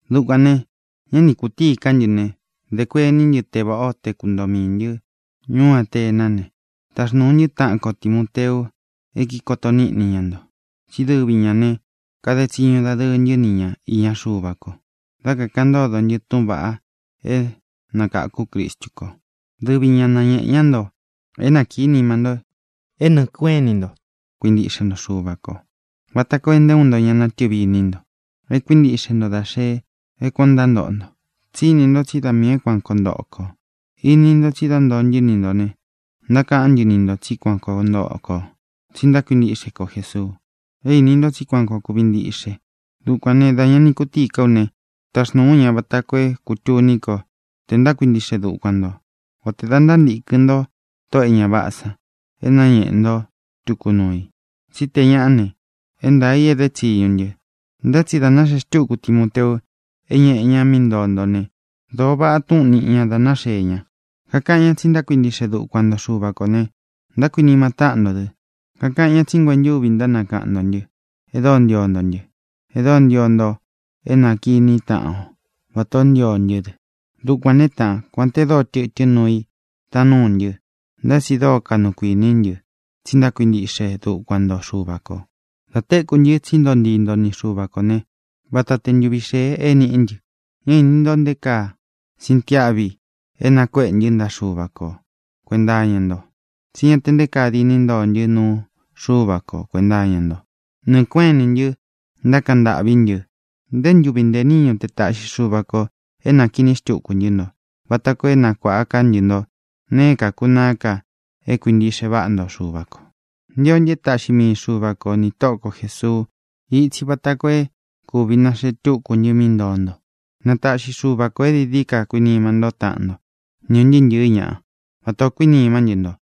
Dukuān né, dā ña ni kutíi ká ntɨ ne, dē kuení ntɨ te vāʼá o te kuntoo miī ntɨ́ ñuú Atená ne, taxnūu ntɨ́ taʼan ko Timōteu e kíkoto níʼni ña nto. Tsí dɨvi ñā ne, kade tsiñu dadɨɨ ntɨ́ ni ña īña Xuva ko dá kākaʼan ntódo ntɨ túʼūn vaʼa é nakáku Cristu ko. Dɨvi ña nañēʼe ñá nto é nakīí nima nto é nɨɨ̄ kueʼén ini nto kuintiʼxe nto Xuva kō, vata koo é nté uun nto ña natɨvi iní nto é kuīntiʼxe nto da xe é kuān ó ntántoʼo nto. Tsí ini nto tsí da miī é kuan koo ntoʼo kō. Ini nto tsi dá ntoo ntɨ́ ni ntō ne, ntákaʼán ntɨ ni ntō tsí kuan koo ntoʼo kō tsi ntákuintiʼxe ko Jēsuu. É īni nto tsí kuān o kúvi ntiʼxe. Dukuān né, dā ña ni kutíi ká u ne, taxnūu ú ña vata koo é kutuní ko te ntákuintiʼxe dukuan ntō, o tē da ntántīkɨn ntó tóʼō e ña váʼā san é nañēʼe nto tuku nuu i, tsí tē ñaʼá ne, é ntaā i é de tsiñu ntɨ. Ntá tsi dā náxee xtúku Timoteu é ñeʼe ñá mí ntoo ntó ne, dōo váʼa túʼūn níʼi ña da náxee ña. Kakaʼan ñá tsi ntákuintiʼxe dukuan nto Xuva kō ne, ntákuinima táʼan nto dɨ. Kakaʼan ñá tsi nguentúvi ntánakaʼan ntō ntɨ́, e dóo ntio nto ntɨ́, e dóo ntio nto é nākiní taʼan o vatā ó ntio ntɨ́ dɨ. Dukuān né, taʼan, kuān te dóo tɨtɨ́n nuu i taan núu ntɨ́, ntá tsi dóo kaʼnu kuiní ntɨ tsi ntákuintiʼxe dukuan nto Xuva kō. Dā téku ntɨ tsí ntoo ntii nto ni Xuva kō né, vata te ntuvi xēe é niʼí ntɨ. Ñá īni nto nté kaa síntiáʼvi é nakuéʼe ntɨ́ ntaʼa Xuva ko kuēnta iña nto, tsi ñá tē nté kaa diní ntoo ntɨ́ nuu Xuva ko kuēnta iña nto. Nɨɨ̄ kuéʼen inī ntɨ ntákaʼan ntâʼví ntɨ ntē ntúvi ntē níñu te taʼxi Xuva kō é nākiní xtuku ntɨ́ nto vata koo é nakuāʼa ká ntɨ nto nēe é kākunaá ka é kuīntiʼxe váʼa nto Xuva kō. Ntio ntɨ é taʼxi mii Xuva ko nī Tóʼo ko Jēsuu itsi vata koo é kūvi naxee túku ntɨ mí ntoo nto. Na taʼxi Xuva kō é dií dií ka kuinima ntó taʼan nto, ni ūn ntɨɨ́ ntɨ̄ɨ́ ñaʼa, vatā ó kuinimá ntɨ nto,